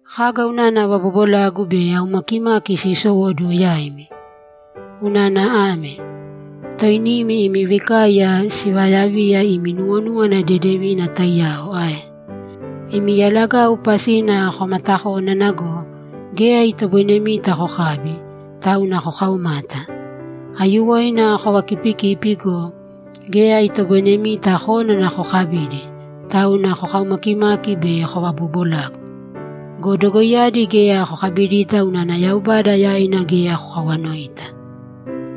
Kaga unana vabobolagu be aumakimaki siisowóduwo yaimi? Unana ame: Toinimi imi vikaiya sivaayaviya imi nuwonúwana dedevina taiyao ae? Imi yalagau pasina komatakónana go, geya itoboinemita kokabi, tauna kokaumata. Aiyuwoina kovakipikipi go, geya itoboinemita kónana kokabidi, tauna kokaumakimaki be kovaboobolagu. Go dogoiyadi geya kokabidita unana Yaubada yaina geya kokawanoita.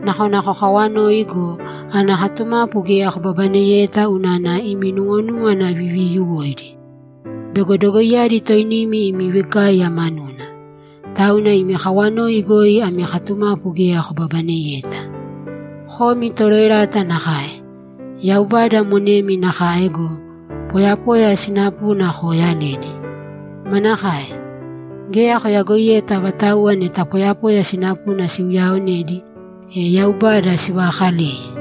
Nakona kokaawanoi go, ana katumapu geya kobabaneyeta unana imi nuwonúwana viviiyuwoidi. Bego dogoiyadi toinimi imi vikaiya manuna. Tauna imi kawanoi goi ami katumapu geya kobabaneyeta. Komi toroerata nakae! Yaubada monemi nakae go, poyapoya sinapuna kooyaledi. Manakae? Geya koyagoiyeta avatauwa neta poyapoya sinapuna siuyaaonedi, e Yaubada sivaakaleye?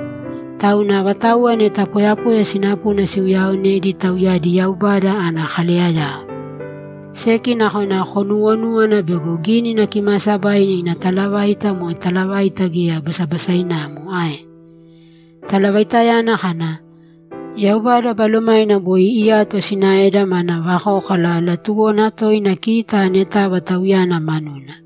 Tauna avatauwa neta poyapoya sinapuna siuyaaonedi tauyadi Yaubada ana kaleyayao. Seki nakona konuwonúwana bego Gínina Kimaasabaina ina talavaita moe talavaita geya basabasainamo ae? Talavaitayana kana, ‘Yaubada Balomaina boi iyato sinaeda mana vakókala latuwona toina kita anetava Tauyana manuna!’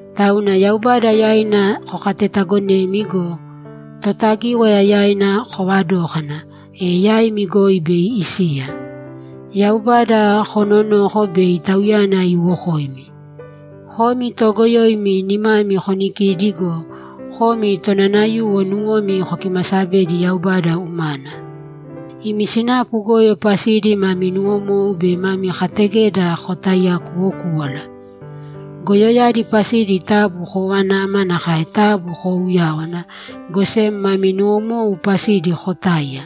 Tauna Yaubada yaina kokatetaagonēmi go, Totagíwaya yaina koovadōkana, e yaimi goi bei isiya. Yaubada koononōko bei Tauyana iiwokoimi. Komi toogoyoimi nimami konikīdi go, komi tonanayuwo nuwomi kokimasabēdi Yaubada umana. Imi sinapu goyo pasidi mami nuwomou be mami kategeda kotaiyakuwokūwala. Goyoyadi pasidi taabu koovanāma nakae taabu koouyāwana, go sem mami nuwomou pasidi kotāiya.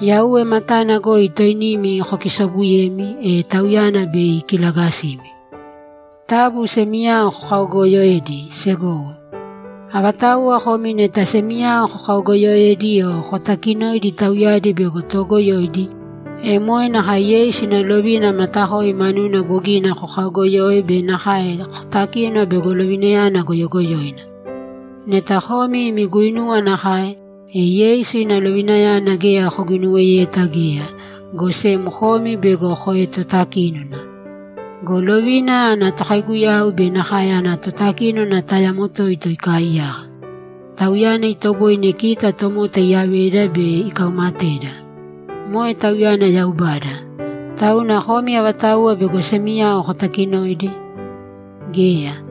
Yauwe matana goi toinimi kokisoobuyēmi, e Tauyana bei ikilagasimi. Taabu semiyao kokaogooyoēdi, segowo. Avatauwa komi neta semiyao kokaogooyoedi o kotaakinoidi tauyadi bego toogoyoidi, e moe nakae Yeisu ina lovina matakoi manuna bogina kokaogoyoe be nakae kotakino bego lovinayana goyogoyoina. Neta komi imi guinuwa nakae, e Yeisu ina lovinayana geya koguinuweyeta geya, go sem komi bego koetotakínona. Go lovina ana Tokaiguyau be nakae ana Totakínona tayamo toito ikaaiyaka. Tauyana itoboine kita tomota iyaveda be ikaumateda. Moe Tauyana Yaubada. Tauna komi avatauwa bego semiyao kotakinoidi? Geya!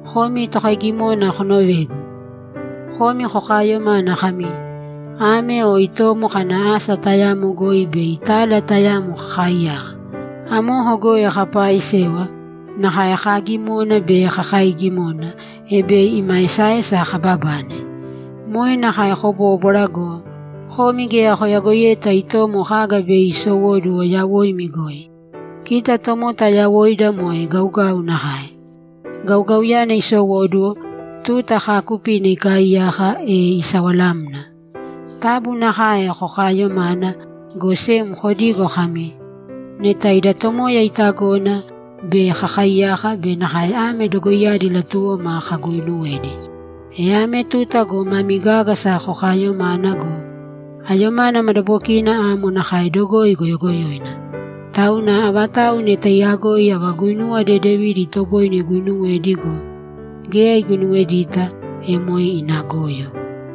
Komi tokaigimona konovēgu! Komi kokaayomana kami, ‘Ame o itomo kana asa tayamo goi bei tala tayamo kakaaiyaka. Amoko goi kapaaisewa, nakae kaagimona be kakaiigimona, e bei ima esaesa kababane.’ Moe nakae kobóbwara go, komi geya koyagoiyeta itomo kaga bei isowóduwo yawoimi goi. Kita tomota yawoida moe gaugau nakae. Gaugauyana isowóduwo, tuta kaakupina ikaaiyaka, e isawalamna. Taabu nakae kokaayomāna, go sem kodīgo kami, ‘Neta ida Tomoya itagona, bei kakaaiyaka be nakae ame dogoiyadi latuwoma kaguuinuwedi.’ E ame tuta go mami gágasa kokaayomana go, ayomana madabokina amo nakae dogoi goyogoyoina. Tauna avatau neta iyagoi ava guinuwa dedevidi itoboine iguinuwedi go, geya iguinuwedita, e moe ina goyo.